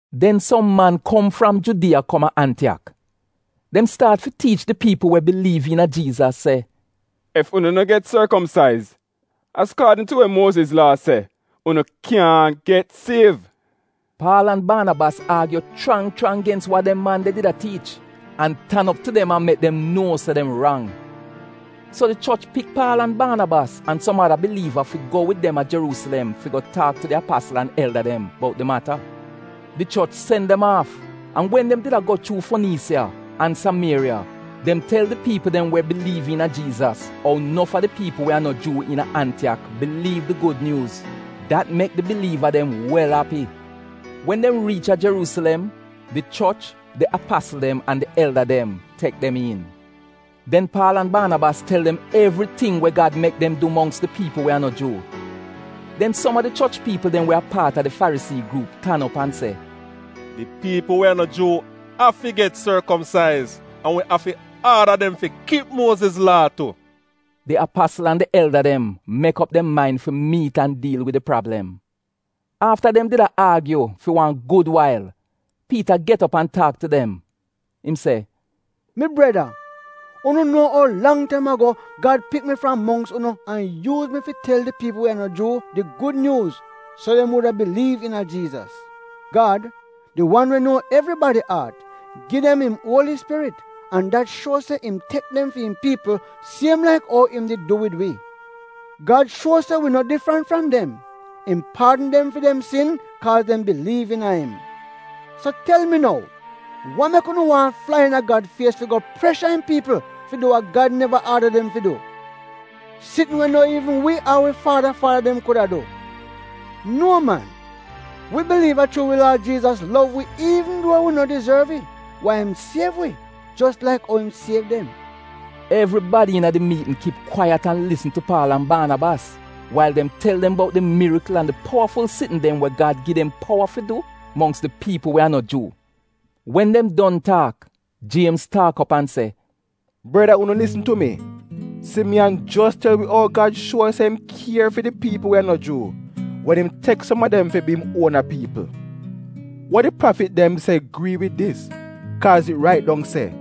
Den som man kom fram Judiya kom a Antiyak. Dem staat fi tiich di piipl we biliiv iina Jiizas se, “Ef unu no get sorkomsaiz azkaadn tu we Muoziz Laa se, unu kyaahn get siev.” Paal an Baanabas aagyu chrang chrang gens wa dem man de did a tiich, an tan op tu dem an mek dem nuo se dem rang. So di choch pik Paal an Baanabas, an som ada biliiva fi go wid dem a Jeruusilem fi go taak tu di apasl an elda dem bout di mata. Di choch sen dem aaf, an wen dem did a go chuu Foniisiya an Samieriya dem tel di piipl dem we biliiv iina Jiizas ou nof a di piipl we a no Juu iina Antiyak biliiv di gud nyuuz. Dat mek di biliiva dem wel api. Wen dem riich a Jeruusilem, di choch, di apasl dem, an di elda dem tek dem iin. Den Paal an Baanabas tel dem evriting we Gad mek dem du mongks di piipl we a no Juu. Den som a di choch piipl dem we a paat a di Farisii gruup tan op an se, “Di piipl we a no Juu afi get sorkomsaiz an wi afi aada dem fi kip Muoziz Laa tu.” Di apasl an di elda dem mek op dem main fi miit an diil wid di prablem. Afta dem did a aagyu fi wan gud wail, Piita get op an taak tu dem. Im se, “Mi breda, unu nuo ou lang taim ago Gad pik mi fram mongks unu an yuuz mi fi tel di piipl we a no Juu di Gud Nyuuz so dem wuda biliiv iina Jiizas. Gad, di wan we nuo evribadi aat, gi dem im Uoli Spirit, an dat shuo se im tek dem fi im piipl siem laik ou im did du wid wi. Gad shuo se wi no difrant fram dem. Im paadn dem fi dem sin kaaz dem biliiv iina im. So tel mi nou, wa mek unu waahn flai iina Gad fies fi go presha im piipl fi du wa Gad neva aada dem fi du, sitn we no iivn wi ar fi wi faada faada dem kuda du? Nuo man! Wi biliiv se a chuu wi Laad Jiizas lov wi iivn duo wi no dizorv it wai im siev wi jos laik ou im siev dem.” Evribadi iina di miitn kip kwaiyat an lisn tu Paal an Baanabas az dem tel dem bout di mirikl an di powaful sitn dem wa Gad gi dem powa fi du mongks di piipl we a no Juu. Wen dem don taak, Jiemz taak op an se, “Breda unu lisn tu mi. Simiyan jos tel wi ou Gad shuo se im kier fi di piipl we a no Juu wen im tek som a dem fi bi im uona piipl. Wa di prafit dem se grii wid dis, kaaz it rait dong se: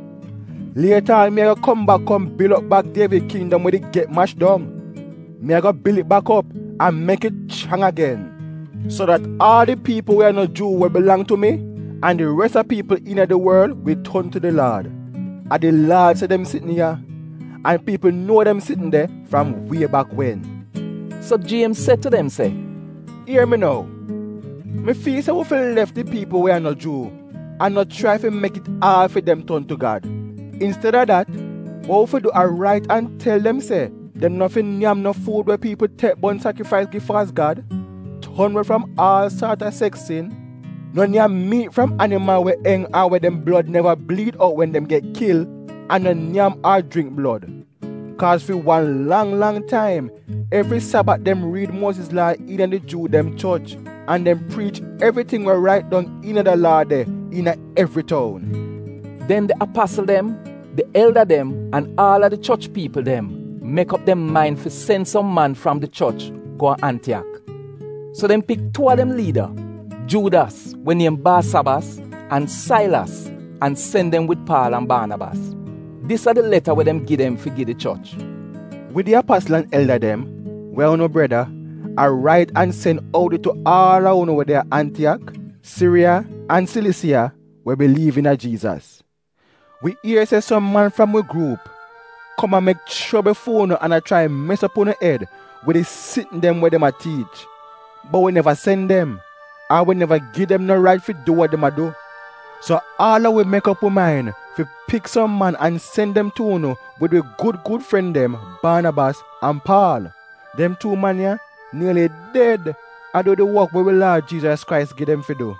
“‘Lieta aan mi ago kom bak kom bil op bak Dievid kindom we did get mash dong. Mi ago bil it bak op, an mek it chrang agen, so dat aal di piipl we a no Juu we bilang tu mi, an di res a piipl iina di worl wi ton tu di Laad. A di Laad se dem sitn ya’ an piipl nuo dem sitn de fram wie bak wen.” So Jiemz se tu dem se, “Ier mi nou, mi fiil se wi fi lef di piipl we a no Juu an no chrai fi mek it aad fi dem ton tu Gad. Insteda dat, wa wi fi du a rait an tel dem se dem no fi nyam no fuud we piipl tek bon sakrifais gi faalz gad, ton we fram aal saat a seks sin, no nyam miit fram animal we enj ar we dem blod neva bliid out wen dem get kil, an no nyam ar jringk blod. Kaaz fi wan lang lang taim, evri Sabat dem riid Muoziz Laa iina di Juu dem choch an dem priich evriting we rait dong iina da Laa de iina evri toun.” Den di apasl dem, di elda dem an aal a di choch piipl dem mek op dem main fi sen som man fram di choch go a Antiyak. So dem pik tuu a dem liida, Juudas (we niem Baasabas) an Sailas an sen dem wid Paal an Baanabas. Dis a di leta we dem gi dem fi gi di choch: Wi, di apasl an elda dem, we a unu breda, a rait an a sen oudi tu aal a unu we de a Antiyak, Siriya, an Silisiya we biliiv iina Jiizas. Wi ier se som man fram wi gruup kom a mek chobl fi unu an a chrai fi mes op unu ed wid di sitn dem we dem a tiich, bot wi neva sen dem, ar wi neva gi dem no rait fi du wa dem a du. So aal a wi mek op wi main fi pik som man an sen dem tu unu wid wi gud gud fren dem, Baanabas an Paal. Dem tuu man ya nieli ded a du di wok we wi Laad Jiizas Krais gi dem fi du.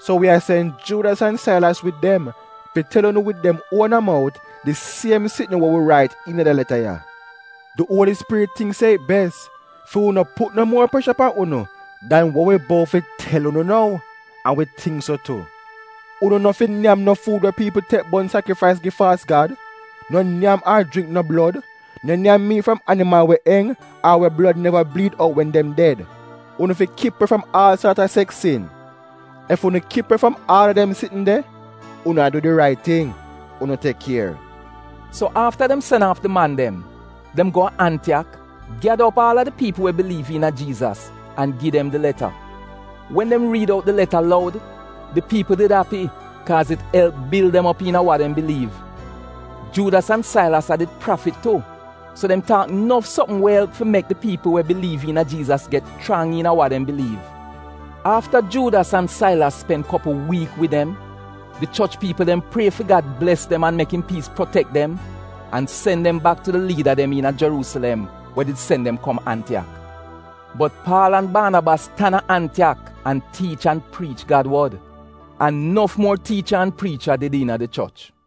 So wi a sen Juudas an Sailas wid dem fi tel unu wid dem uona mout di siem sitn wa wi rait iina da leta ya. Di Uoli Spirit tingk se it bes fi wi no put no muo presha pan unu dan dem ya wa mi ago tel unu nou, an wi tingk so tu. Unu no fi nyam no fuud we piipl tek bon sakrifais gi faalz gad, no nyam ar jringk no blod, no nyam miit fram animal we enj ar we dem blod neva bliid out wen dem ded. Unu fi kip we fram aal saat a seks sin. Ef unu kip we fram aal a dem sitn de, unu a du di rait ting. Unu tek kier. So afta dem sen aaf di man dem, dem go a Antiyak, gyada op aal a di piipl we biliiv iina Jiizas, an gi dem di leta. Wen dem riid out di leta loud, di piipl did api kaaz it elp bil dem op iina wa dem biliiv. Juudas an Sailas a did prafit tu so dem taak nof sopm we elp fi mek di piipl we biliiv iina Jiizas get chrang iina wa dem biliiv. Afta Juudas an Sailas spen kopl wiik wid dem, di choch piipl dem prie fi Gad bles dem an mek im piis protek dem an sen dem bak tu di liida dem iina Jeruusilem we did sen dem kom Antiyak. Bot Paal an Baanabas tan a Antiyak an tiich an priich Gad wod. An nof muor tiicha an priicha did iina di choch.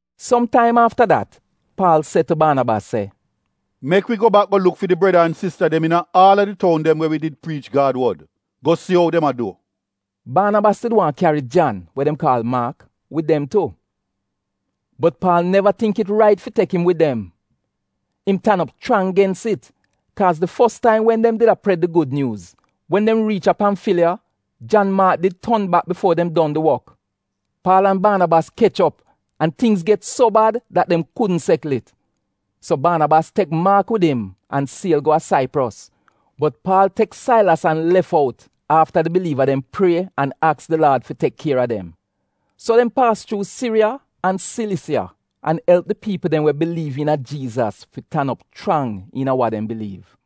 Som taim afta dat Paal se tu Baanabas se, “Mek wi go bak go luk fi di breda an sista dem iina aal a di toun dem we wi did priich Gad wod go si ou dem a du.” Baanabas did waahn kyari Jan, we dem kaal Maak, wid dem tu. Bot Paal neva tingk it rait fi tek im wid dem. Im tan op chrang gens it, kaaz di fos taim wen dem did a pred di Gud Nyuuz, wen dem riich a Pamfiliya, Jan Maak did ton bak bifuo dem don di wok. Paal an Baanabas kech op an tingz get so bad dat dem kudn sekl it. So Baanabas tek Maak wid im an siel go a Saipros, bot Paal pik Sailas an lef out afta di biliiva dem prie an aks di Laad fi tek kier a dem. So dem paas chuu Siriya an Silisiya an elp di piipl dem we biliiv iina Jiizas fi tan op chrang iina wa dem biliiv.